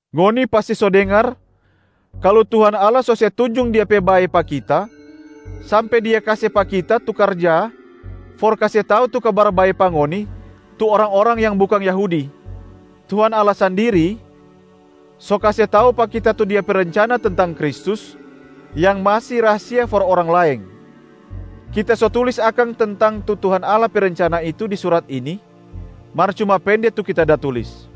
Ngoni pasti so dengar kalu Tuhan Allah so se tunjung Dia pe bae pa kita sampe Dia kase pa kita tu karja for kase tau tu Kabar bae pa ngoni tu orang-orang yang bukang Yahudi. Tuhan Allah sandiri so kase tau pa kita tu Dia pe rencana tentang Kristus yang masi rahasia for orang laeng. Kita so tulis akang tentang tu Tuhan Allah pe rencana itu di surat ini, mar cuma pende tu kita da tulis.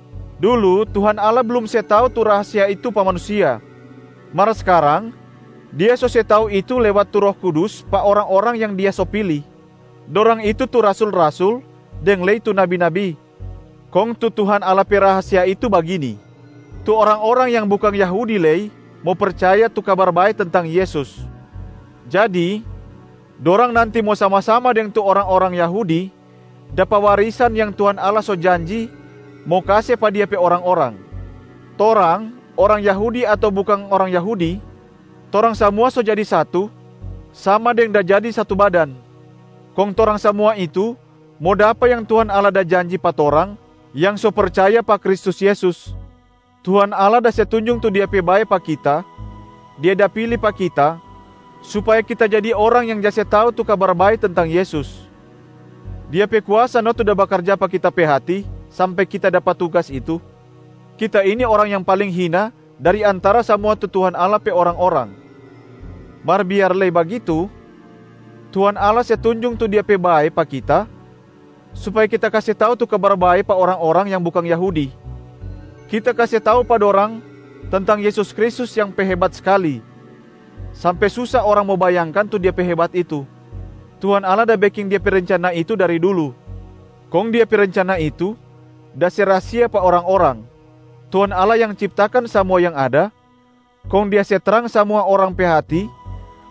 Dulu, Tuhan Allah blum se tau tu rahasia itu pa manusia, mar skarang Dia so se tau itu lewat tu Roh Kudus pa orang-orang yang Dia so pili, dorang itu tu rasul-rasul deng lei tu nabi-nabi. Kong tu Tuhan Allah pe rahasia itu bagini: tu orang-orang yang bukang Yahudi lei mo percaya tu Kabar Bae tentang Yesus, jadi dorang nanti mo sama-sama deng tu orang-orang Yahudi dapa warisan yang Tuhan Allah so janji mo kase pa Dia pe orang-orang. Torang, orang Yahudi ato bukang orang Yahudi, torang samua so jadi satu sama deng da jadi satu badan. Kong torang samua itu mo dapa yang Tuhan Allah da janji pa torang yang so percaya pa Kristus Yesus. Tuhan Allah da se tunjung tu Dia pe bae pa kita, Dia da pili pa kita supaya kita jadi orang yang ja se tau tu Kabar Bae tentang Yesus. Dia pe kuasa no tu da bakarja pa kita pe hati sampe kita dapa tugas itu. Kita ini orang yang paling hina dari antara samua tu Tuhan Allah pe orang-orang. Mar biar lei bagitu, Tuhan Allah se tunjung tu Dia pe bae pa kita supaya kita kase tau tu Kabar Bae pa orang-orang yang bukang Yahudi. Kita kase tau pa dorang tentang Yesus Kristus yang pe hebat skali, sampe susa orang mo bayangkan tu Dia pe hebat itu. Tuhan Allah da beking Dia pe rencana itu dari dulu, kong Dia pe rencana itu da se rahasia pa orang-orang. Tuhan Allah yang ciptakan samua yang ada, kong Dia se trang samua orang pe hati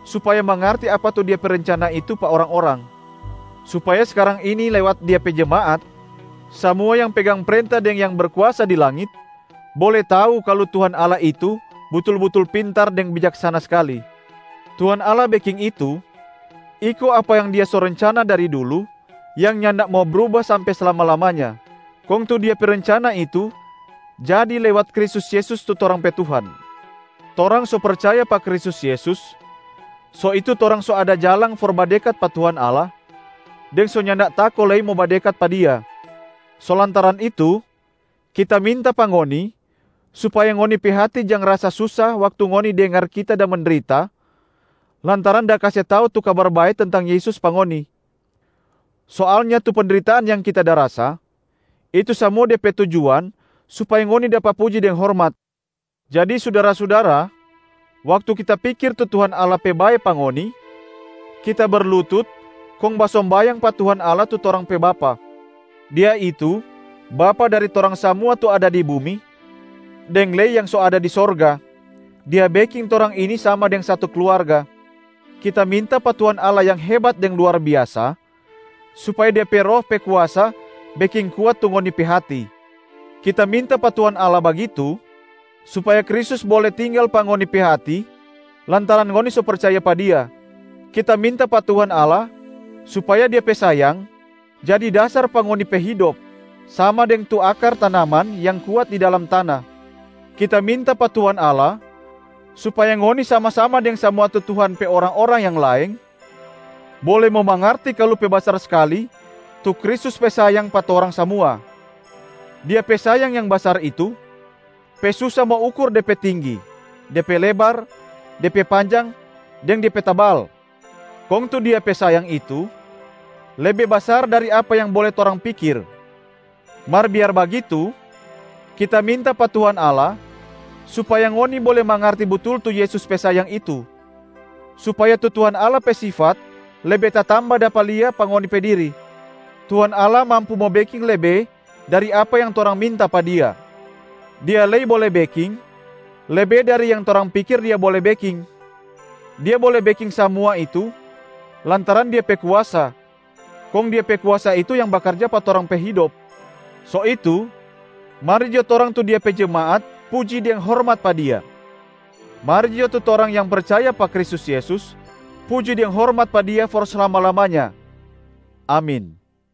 supaya mangarti apa tu Dia pe rencana itu pa orang-orang, supaya skarang ini lewat Dia pe jemaat, samua yang pegang prenta deng yang berkuasa di langit bole tau kalu Tuhan Allah itu butul-butul pintar deng bijaksana skali. Tuhan Allah beking itu iko apa yang Dia so rencana dari dulu yang nyanda mo bruba sampe slama-lamanya, kong tu Dia pe rencana itu jadi lewat Kristus Yesus tu torang pe Tuhan. Torang so percaya pa Kristus Yesus so itu torang so ada jalang for badekat pa Tuhan Allah deng so nyanda tako lei mo badekat pa Dia. So lantaran itu, kita minta pa ngoni supaya ngoni pe hati jang rasa susa waktu ngoni dengar kita da mendrita lantaran da kase tau tu Kabar Bae tentang Yesus pa ngoni. Soalnya tu pendritaan yang kita da rasa, itu samua de pe tujuan supaya ngoni dapa puji deng hormat. Jadi sudara-sudara, waktu kita pikir tu Tuhan Allah pe bae pa ngoni, kita berlutut kong basombayang pa Tuhan Allah tu torang pe Bapa. Dia itu Bapa dari torang samua tu ada di bumi deng lei yang so ada di sorga, Dia beking torang ini sama deng satu kluarga. Kita minta pa Tuhan Allah yang hebat deng luar biasa supaya Dia pe Roh pe kuasa beking kuat tu ngoni pe hati. Kita minta pa Tuhan Allah bagitu supaya Kristus bole tinggal pa ngoni pe hati lantaran ngoni so percaya pa Dia. Kita minta pa Tuhan Allah supaya Dia pe sayang jadi dasar pa ngoni pe hidop, sama deng tu akar tanaman yang kuat di dalam tana. Kita minta pa Tuhan Allah supaya ngoni sama-sama deng samua tu Tuhan pe orang-orang yang laeng, bole mo mangarti kalu pe basar skali tu Kristus pe sayang pa torang samua. Dia pe sayang yang basar itu, pe susa mo ukur de pe tinggi, de pe lebar, de pe panjang deng de pe tabal. Kong tu Dia pe sayang itu, lebe basar dari apa yang bole torang pikir. Mar biar bagitu, kita minta pa Tuhan Allah supaya ngoni bole mangarti butul tu Yesus pe sayang itu, supaya tu Tuhan Allah pe sifat lebe tatamba dapa lia pa ngoni pe diri. Tuhan Allah mampu mo beking lebe dari apa yang torang minta pa Dia, Dia lei bole beking lebe dari yang torang pikir Dia bole beking. Dia bole beking samua itu lantaran Dia pe kuasa, kong Dia pe kuasa itu yang bakarja pa torang pe hidop. So itu, mari jo torang tu Dia pe jemaat puji deng hormat pa Dia, mari jo tu torang yang percaya pa Kristus Yesus puji deng hormat pa Dia for slama-lamanya. Amin.